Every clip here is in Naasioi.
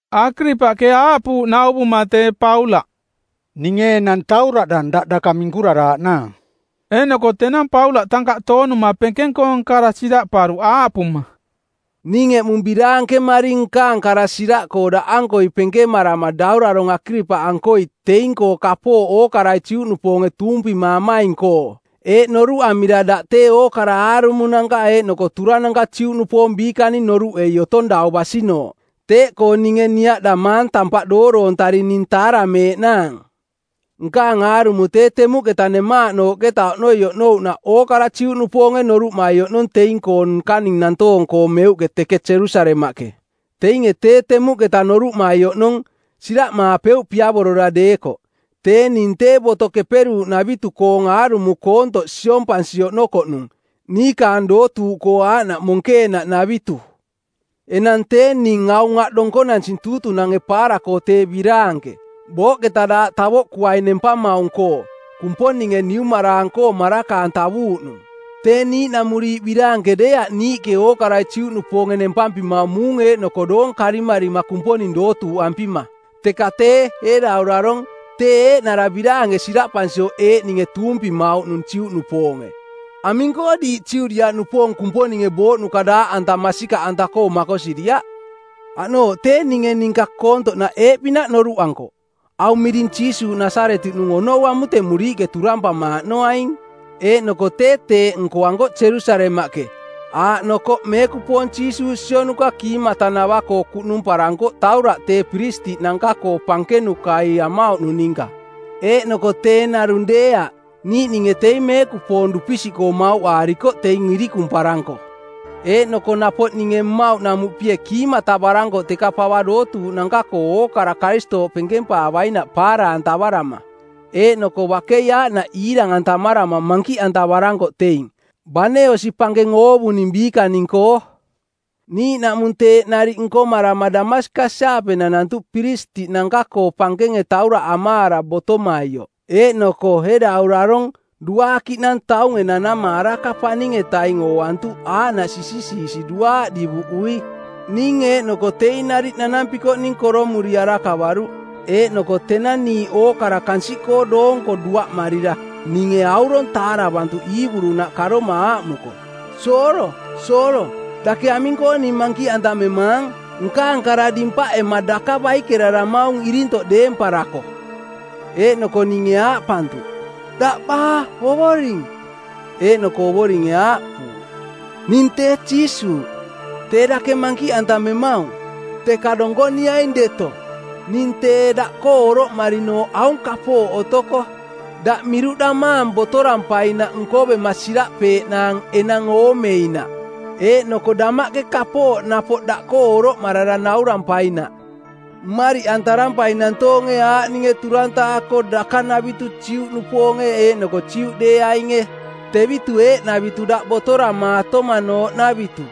Akiripaꞌke aaꞌpuuꞌ nauvuma tee Paulaꞌ, “Ninge enang tauraꞌdang daꞌ daka minkuraraaꞌnaang.” Eeꞌnoko tenang Paulaꞌ tankaꞌ toonuma penkeng-koong kara siraꞌparuꞌ aaꞌpuma, “Ning eꞌmung biraankemaring nkaang kara siraꞌkoo daꞌankoi penkemarama Daurarong˜ Akiripaꞌankoi teing kapooꞌ ookarai Juꞌnupoonge tuumpimaamaing-koo, eeꞌ noruꞌamira daꞌ tee ookara aarumonanka eeꞌnoko turananka Juꞌnupoong biikaning noruꞌei otomaung dau basinooꞌ. Teeꞌkoo ninge niaꞌdamaang tampaꞌ dooroontari ning taarameeꞌnaang. “Nkaang aarumo tee temuꞌketa nemaaꞌnooꞌketa oꞌnoi oꞌnouꞌnaꞌ ookara Juꞌnupoonge noruꞌmai oꞌnong teing-koo nkaning nantoong-koo meuꞌke teke Jerusalemaꞌke. Teinge tee temuꞌketa noruꞌmai oꞌnong, siraꞌmaapeuꞌ piavorora deekoꞌ, tee ning tee Boto-koo Keperuuꞌnavitu-koong aarumo koontoꞌ siompansi oꞌnokoꞌnung, niikaang dootuuꞌkoo aaꞌnaꞌ monkeenaꞌnavitu. Enang tee ning aung aꞌ donkonansing tuutunange paara-koo tee biraanke, booꞌketa daaꞌ tavoꞌkuaing nempamaung-koo, Kumponinge niumaraang-koo maraka-antavuuꞌnung. Tee niiꞌnamuriiꞌ biraanke deeaꞌ niiꞌke ookarai Juꞌnupoonge nempampimaung muung eeꞌnoko doong karimarima Kumponing dootuuꞌampima. Teka tee, ee daurarong, tee eeꞌnara biraanke siraꞌpansioꞌ eeꞌninge tuumpimaamaung Juꞌnupoonge. Aming-koo diiꞌ Judiaꞌnupoong Kumponinge booꞌnuka daaꞌanta masikaꞌanta-koo makosiriaꞌ? “Aꞌnooꞌ ninge tee ninka koontoꞌnaꞌ eeꞌpinaꞌ noruꞌankoꞌ: Aung miring Jiisuuꞌ Nasaretiꞌnung onou amutemuriiꞌke turampamaaꞌnoaing. Eeꞌnoko tee teeꞌ nkoankoꞌ Jerusalemaꞌke, aaꞌnokoꞌ meekupoong Jiisuuꞌ sionuka kiimatanava-koo kuꞌnumparankoꞌ tauraꞌ tee piristiꞌnanka-koo pankenankai amauꞌnung ninka, eeꞌnoko tee narung deeaꞌ, niiꞌninge teing meekupoong dupisiꞌkoo mauꞌaarikoꞌ teing irikumparanko. Eeꞌnoko napoꞌ ninge mmauꞌnamuꞌpie kiimatavarankoꞌ teka pava dootuuꞌnanka-koo ookara-koo Karistooꞌ penkempaavainaꞌ paara-antavarama. Eeꞌnoko bakei aaꞌnaꞌ iirang-antamarama mankiꞌantavarankoꞌ teing, bane osi pankeng oovuning biikaning-koo.” “Niiꞌnaꞌmung teeꞌ nariꞌ nkomarama Damaskas-aape nanantuꞌ piristiꞌnanka-koo pankenge tauraꞌ amaara botomaioꞌ. Eeꞌnoko ee daurarong, duaakiꞌnang taunge nanama araka paning-etaing ooantuꞌ aaꞌnaꞌ sisisiisi duaaꞌ divuꞌui. Ning eeꞌnoko teing nariꞌ nanampikoꞌning koromuri arakavaruꞌ. Eeꞌnoko tenang niiꞌ ookara kansiꞌkoo doonko duaꞌmarira ninge aurong taaravantuꞌ Iiburunaꞌ karoma aaꞌmuko, ‘Soolo, Soolo, dake aming-koo ning mankiꞌantamemaang? Nkaang kara dimpaꞌema daka baikeraramaung irintoꞌ deemparako.’ “Eeꞌnoko ninge aaꞌpantuꞌ, ‘Daꞌ baa Ovoring?’ Eeꞌnoko Ovoringe aaꞌpuuꞌ, ‘Ning tee Jiisuuꞌ, tee dake mankiꞌantamemaung. Teka donkoniaing deto, ning tee daꞌkoo oroꞌmarinooꞌ aung kapooꞌ otoko: Daꞌ miruꞌdamaang botorampainaꞌ nkovema siraꞌpeeꞌnaang enang oomeinaꞌ eeꞌnoko damaꞌke kapooꞌ napoꞌ daꞌkoo oroꞌmarara naurampainaꞌ. Mmariꞌantarampaing nantoonge aaꞌninge turantaako dakanavitu Juꞌnupoonge eeꞌnoko Juꞌdeeainge, tevitu eeꞌnavitu daꞌ botoramaatomanooꞌnavitu.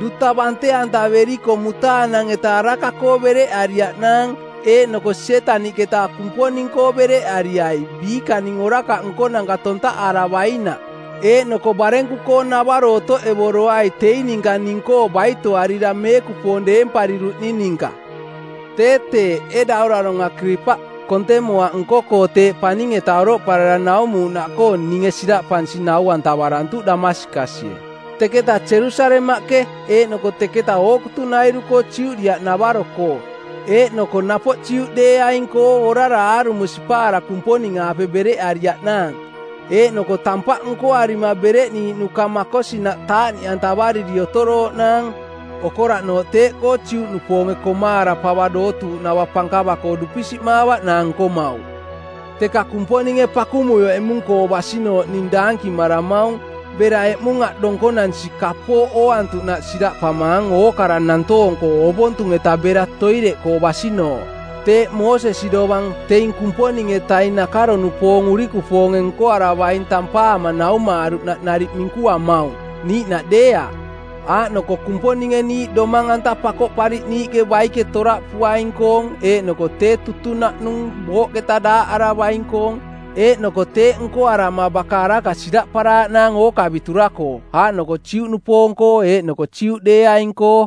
Duta bante-antaveriko mutaanang-eta araka-koo bereꞌariaꞌnaang eeꞌnoko Sietaniꞌketa Kumponing-koo bereꞌariai biikaning orakaꞌ nkonanka tontaꞌaravainaꞌ, eeꞌnoko barenku-koo-navaro otoꞌevoroai teing ninka ning-koo baitoarira meekupoong deempariruꞌning ninka.’” “Tee teeꞌ, ee Daurarong Akiripaꞌ, kontemoaꞌ nko-koo teeꞌ paning-eta oroꞌparara naumuuꞌnaꞌkoo ninge siraꞌpansi nau-antavarantuꞌ Damaskasie, teketaꞌ Jerusalemaꞌke eeꞌnoko teketa ookutunairu-koo Judiaꞌnavaro-koo eeꞌnoko napoꞌ Juꞌdeeaing-koo orara aarumo sipaara Kumponing-aape bereꞌariiꞌnaang, eeꞌnoko tampaꞌ nkoarima bereꞌniiꞌnuka makosinaꞌ taaꞌniꞌantavariri otorooꞌnaang. Okoraꞌnooꞌ teeꞌkoo Juꞌnupoonge komaara pava dootuuꞌnava pankava-koo dupisiꞌmaavaꞌnaang nkomauꞌ. Teka Kumponinge pakumuioꞌ eꞌmung-koo basinooꞌ ning daankimaramaung bera eꞌmung aꞌ donkonansi kapooꞌ ooantuꞌnaꞌ siraꞌpamaang ookara nantoong-koo ovontung-eta bera toireꞌkoo basinooꞌ. Teeꞌ Moosesi dovang teing Kumponing-etaning nakaro-nupoong urikupoonge nkoaravaing tampaama naumaaruꞌnaꞌ nariꞌ minkuamaung, niiꞌnaꞌ deeaꞌ. Aaꞌnoko Kumponinge niiꞌ domang-anta-koo Pakoꞌpariꞌniiꞌke baike toraꞌpuaing-koong eeꞌnoko tee tutunaꞌnung booꞌketa daaꞌaravaing-koong, eeꞌnoko teeꞌ nkoarama baka araka siraꞌparaaꞌnaang ookavitura-koo aaꞌnoko Juꞌnupoong-koo eeꞌnoko Juꞌdeeaing-koo.”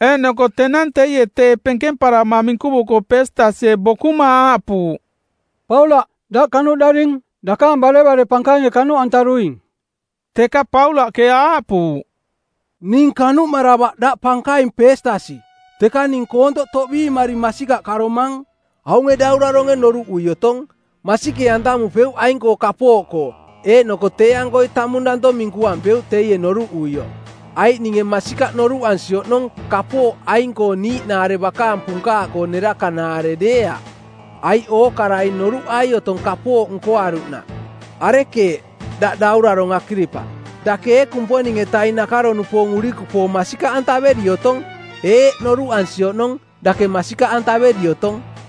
Eeꞌnoko tenang teie teeꞌ penkemparama minkuvuko Peestasie bokuma aaꞌpuuꞌ, “Paulaꞌ, daꞌ kanuꞌdaring. Dakaang barevare pankainge kanuꞌantaruing.” Teka Paulaꞌke aaꞌpuuꞌ, “Ning kanuꞌmaravaꞌ, daꞌ pankaing Peestasi, teka ning koontoꞌ toꞌbiimari masikaꞌ karomang. Aunge dauraronge noruꞌui otong, masikee-antamupeuꞌ aing-koo kapooꞌkoo, eeꞌnoko tee-ankoi tamung danto minkuampeuꞌ teie noruꞌuioꞌ, aiꞌ ninge masikaꞌ noruꞌansi oꞌnong kapooꞌ aing-koo niiꞌnaare bakaang punkaaꞌkoo nerakanaare deeaꞌ, aiꞌ ookarai noruꞌai otong kapooꞌ nkoaruꞌnaꞌ. Arekeeꞌ daꞌ daurarong Akiripaꞌ, dake ee Kumponing-etaning nakaro-nupoong urikupoong masikaꞌantaveri otong? Eeꞌ, noruꞌansi oꞌnong, dake masikaꞌantaveri otong.”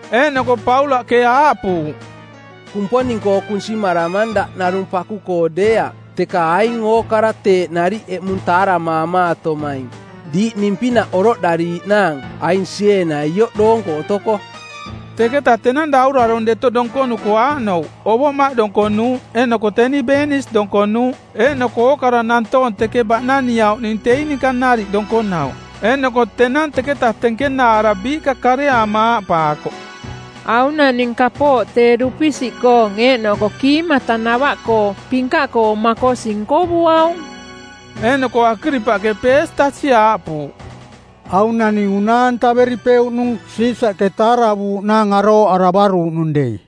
Eeꞌnoko Paulaꞌke aaꞌpuuꞌ, “Kumponing-koo kunsimaramang daꞌ narung paku-koo deeaꞌ teka aing ookara teeꞌ nariꞌ eꞌmung taaramaamatomaing diiꞌ ning-pinaꞌ oroꞌdariiꞌnaang aing sieena ioꞌ doonko otoko.” Teketa tenang daurarong deto donkonuko aaꞌnouꞌ ovoꞌmaꞌ donkonuuꞌ eeꞌnoko teni Beenis donkonuuꞌ eeꞌnoko ookara nantoong teke baꞌnaniauꞌning teing ninka nariꞌ donkonauꞌ. Eeꞌnoko tenang teketa tenkenaara biiꞌka kareaama aaꞌpaakoꞌ, “Aung naning kapooꞌ tee dupisiꞌkoong eeꞌnoko kiimatanava-koo pinkaꞌkoong makosi nkovuaung.” Eeꞌnoko Akiripaꞌke Peestasi aaꞌpuuꞌ, “Aung naning unaa-antaveripeuꞌnung Siisaꞌke taaravuuꞌnaang arooꞌaravaruuꞌnung dei.”